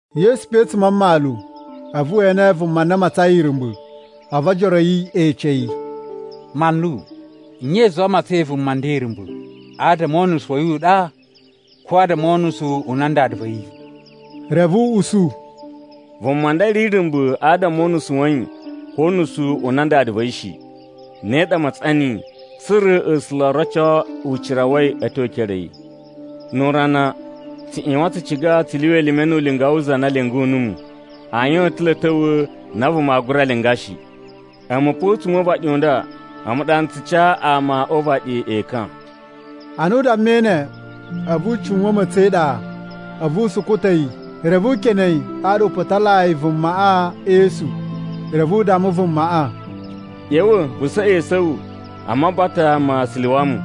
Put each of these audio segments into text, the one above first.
Yesu pe a̱tsuma̱ a mmalu, a̱vu we ene vuma na a matsain irumba̱. A̱vu ojoro a̱ yi e ece yi, “Manlu, nye i zuwai a matsain vuma nda irumba̱? Adama o unusu wa̱ yi u ɗa ko adama o unusu u nan dada va̱ yi?” Reve u usu, “Vuma nda ri irumba̱ adama o unusu wa̱ yi ko o unusu u nan dada va̱ yi shi. Ne ɗa a matsan niyi tsa̱ra̱ A̱sula̱ o roco ucira wa̱ yi a̱ tyo e ekere a̱ yi. Nu urana, tsu ꞌyuwan tsu ciga tsu lyuwa elime nu ulinga wu za na lyungu numu. Ayin o ta̱ lo a̱ ta̱wa̱ na vuma aa gura linga shi. A̱mu pa a̱tsuma̱ o uvaɗi u nda, a̱mu ɗa n tsu ca ama o uvaɗi ekan.” Ana u dammai ne, a̱vu u tsuwa̱n ma̱tsa̱n e iɗa, a̱vu u sukuta̱ yi, reve u kene yi ɗaɗa u putalayi vumaꞌa e esu. Reve u damma vumaꞌa, “ꞌYa̱wa̱ vu saꞌa esu a̱ wu a Mabata ma Siluwamu.”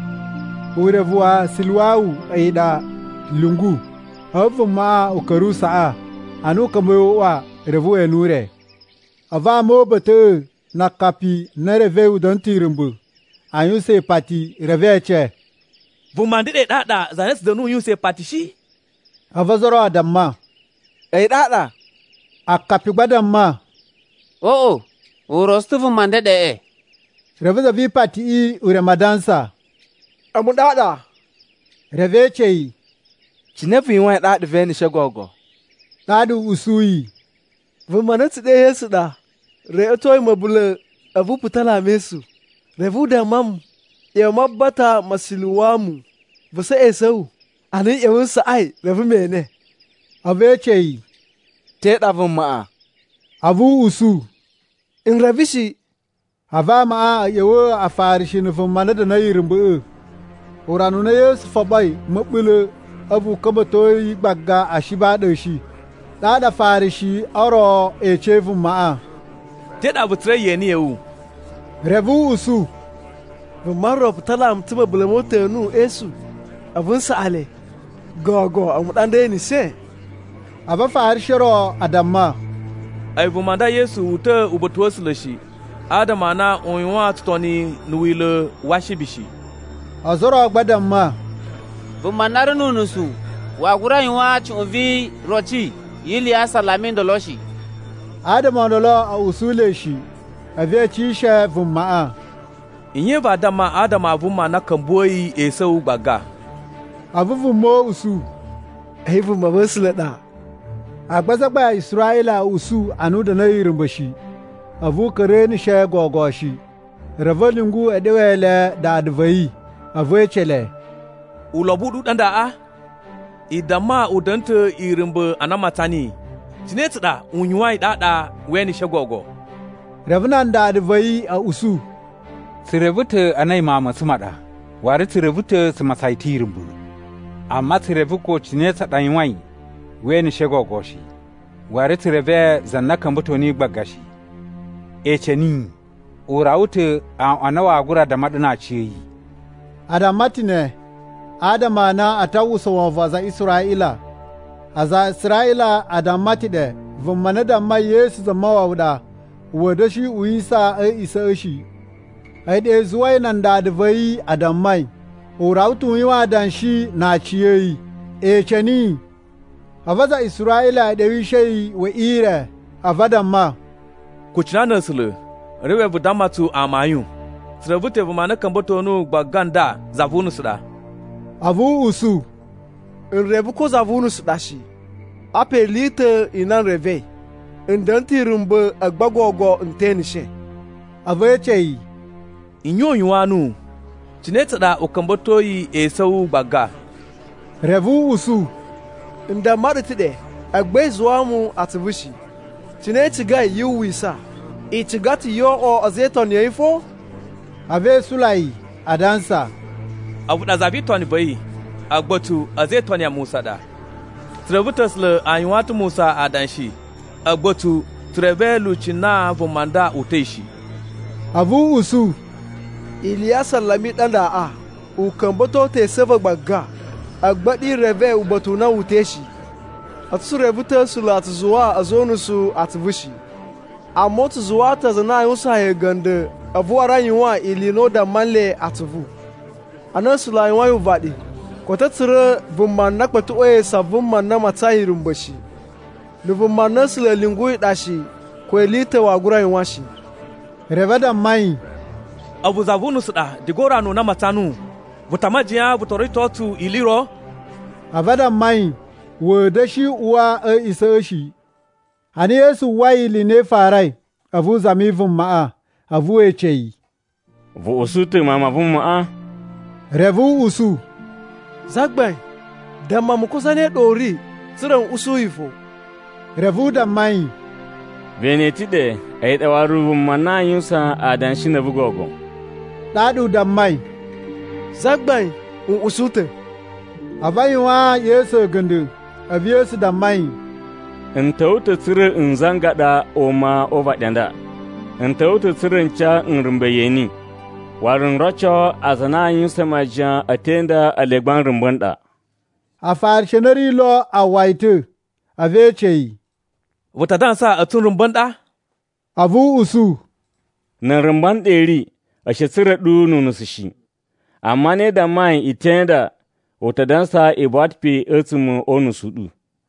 (Urevu wa “Siluwamu” a̱yi ɗa “Lyungu.”) A̱vu vumaꞌa u ka̱ra̱ u saꞌa. Ana a̱ ka̱mba̱i o uꞌwa, reve we ene ure. A̱vu ama o uba̱ta̱ꞌa̱ na akapi a na e revei u da̱na̱ ta̱ irumba̱ a yuwusan ipati reve e ece, “Vuma ndeɗe ɗaɗa, za na tsu da̱nusu a yuwusan ipati shi?” A̱vu ozo o ro a damma, “A̱yi ɗaɗa.” Akapi gba a damma, “Oꞌo, u rotso ta̱ vuma ndeɗeꞌe.” Reve zavipatiꞌi u reme adansa, “A̱mu ɗaɗa!” Reve e ece yi, “Cine vu yuwain ɗaɗa ve eneshe gogo?” Ɗaɗa u usuyi, “Vuma na a̱ tsu ɗe Yesu ɗa reꞌwetoi ma̱bula̱ a̱vu u putala mu e esu. Reve u damma mu, ‘ꞌYa̱wa̱ a Mabata ma Siluwamu vu saꞌa esu a̱ wu.’ Ana n ꞌya̱wa̱ n saꞌai, reve me ene.” A̱vu e ece yi, “Te ɗa vumaꞌa?” A̱vu u usu, “N reve shi.” A̱vu amaꞌa a̱ ꞌya̱wa̱a̱ Afarishi na̱ vuma na da̱na̱i irumba̱ꞌa̱. Urana u na Yesu foɓoi ma̱bula̱ a̱vu u ka̱mba̱to yi gbaga Ashibi a ɗa a̱ shi. Ɗaɗa Afarishi o ro e ecei vumaꞌa, “Te ɗa vu tsura̱i yeni ya̱ wu?” Reve u usu, “Vuma ro putala mu ta̱ ma̱bula̱ mo uta̱nu e esu, a̱vu n saꞌa le, gogo a̱mu ɗa nda e eneshe.” A̱vu Afarishi o ro a damma, “A̱yi vuma nda Yesu, wu uta̱ uba̱ta̱ wa̱ A̱sula̱ shi, adama a na u yuwan tsutoni na̱ wila̱ wa Ashibi shi.” Ozo o ro gba a damma, “Vuma na ri nu unusu waa gura yuwan cuꞌun vi iroci yi ili ya asalama o ndolo shi.” Adama o ndolo a̱ usula̱i shi. A̱vu e ecishe vumaꞌa, “Nye vaa damma adama a vuma na ka̱mbuwa̱i esu a̱ wu gbaga?” A̱vu vuma u usu, “A̱yi vumava̱sula̱ ɗa.” Agba azagbain a Israꞌila a̱ usu a na u da̱na̱i irumba̱ shi, a̱vu u ka̱ra̱ eneshe gogo shi. Reve a̱ lyungu e ɗewe le nan dada va̱ yi. A̱vu e ece le, “Ulobo u ɗu u ɗa ndaꞌa? I damma u da̱na̱ ta̱ irumba̱ ana i matsan niyi. Cine tsa ɗa u yuwain ɗaɗa we eneshe gogo?” Reve nan dada va̱ yi a̱ usu, “Tsu reve ta̱ a na a̱yi mawun ma̱ tsu ma ɗa, waru tsu reve ta̱ tsu matsan yi ta̱ irumba̱. Amma tsu reve ko cine tsa ɗa u yuwain we eneshe gogo shi. Waru tsu reve za na ka̱mba̱to niyi gbaga shi. Ece niyi. U rawa ta̱ aꞌwan a na waa gura damma ɗu na aciya̱yi.” A damma ta̱ ne adama a na a ta uwwusa wovon wa aza a Israꞌila. Aza a Israꞌila a damma ta̱ ɗe vuma na dammai Yesu Zamawawa ɗa, wa̱a̱ da̱shi uwisa a̱ a̱a̱ꞌisa̱ shi. A̱yi ɗa i zuwai nan dada va̱ yi a dammai, “U rawa ta̱ u yuwan adanshi na aciya̱yi. Ece niyi!” A̱vu aza a Israꞌila e ɗewishe yi we ire a̱vu a damma, “Kucina na̱ A̱sula̱ reve vu damma tsu amayun! Tsu reve ta̱ vuma na ka̱mba̱to nuwu gbaga nda za vu unusu ɗa.” A̱vu u usu, “N reve ko za vu unusu ɗa shi. Apa ili i ta̱ i na n revei: N da̱na̱ ta̱ irumba̱ agba gogo n te eneshe.” A̱vu e ece yi, “Nye u yuwaan nuwu? Cine tsa ɗa u ka̱mba̱toi esu a̱ wu gbaga?” Reve u usu, “N damma ɗu ta̱ ɗe, agba i zuwaa mu atsuvu shi. Cine i cigai yu uwwisa? I ciga ta̱ yoo oꞌwo a̱za̱ e itoni a̱ yi fo?” A̱vu e isula yi adansa, “A̱vu ɗa za vi itoni va̱ yi, agba a̱tsu a̱za̱ e itoni ya Musa a ɗa. Tsu reve ta̱ A̱sula̱ a yuwaan ta̱ Musa adanshi, agba a̱tsu tsu reve lyuci na vuma nda uta̱i shi.” A̱vu u usu, “Ili ya asalama i ɗa ndaꞌa! U ka̱mba̱to ta̱ esu a̱ va̱ gbaga, agba a̱ɗu i reve uba̱ta̱ u na wu uta̱i shi. A̱tsu tsu reve ta̱ A̱sula̱ a tsu zuwaa a̱za̱ o unusu atsuvu shi. Amma u tsu zuwaa ta̱ aza a na a yuwusaan yi a̱ga̱nda̱ a̱vu waru a yuwan ili i na u damma nle atsuvu. Ana A̱sula̱ a yuwain uvaɗi, koto a̱ tsura̱ vuma na kpa̱tuꞌwa̱i esu a vuma na a matsain irumba̱ shi. Na̱ vuma na A̱sula̱ a̱ lyunguyi ɗa shi, ko ili i ta̱ waa gura yuwan shi.” Reve a damma yi, “A̱vu za vu unusu ɗa diga urana u na a matsan nuwu! Vu ta a majiyan vu to rito tsu ili i ro?” A̱vu a damma yi wa̱a̱ da̱shi uwa a̱ a̱a̱ꞌisa̱ shi. Ana Yesu uwwai ili i na i farai, a̱vu u zami vumaꞌa, a̱vu we ece yi, “Vu usu ta̱ Mawun ma Vumaꞌa?” Reve u usu, “Zagbain, damma mu ko zane ɗa u ri, tsa̱ra̱ n usu yi fo.” Reve u damma yi, “Ve ene yi ta̱ ɗe, a̱yi ɗa waru vuma na a yuwusan adanshi na̱ a̱vu gogo.” Ɗaɗa u dammai, “Zagbain, n usu ta̱!” A̱vu u yuwaan Yesu a̱ga̱nda̱. A̱vu Yesu damma yi, “N ta̱wa̱ ta̱ tsa̱ra̱ n zangaɗa ama o uvaɗi a nda. N ta̱wa̱ ta̱ tsa̱ra̱ n ca nrumba̱ yeni, waru n roco aza a na a yuwusan majiyan a̱ te inda ele gba nrumba̱ n ɗa.” Afarishi a na a̱ ri lo a uwwa yi ta̱, a̱vu e ece yi, “Vu ta dansa a̱tsu nrumba̱ n ɗa?” A̱vu u usu, “Na̱ nrumba̱ n ɗa i ri, a̱ shi a̱ tsura̱ ɗu nu unusu shi. Amma ana i dammai i te inda, u ta dansa i buwa ta̱ pe a̱tsuma̱ o unusu u ɗu.”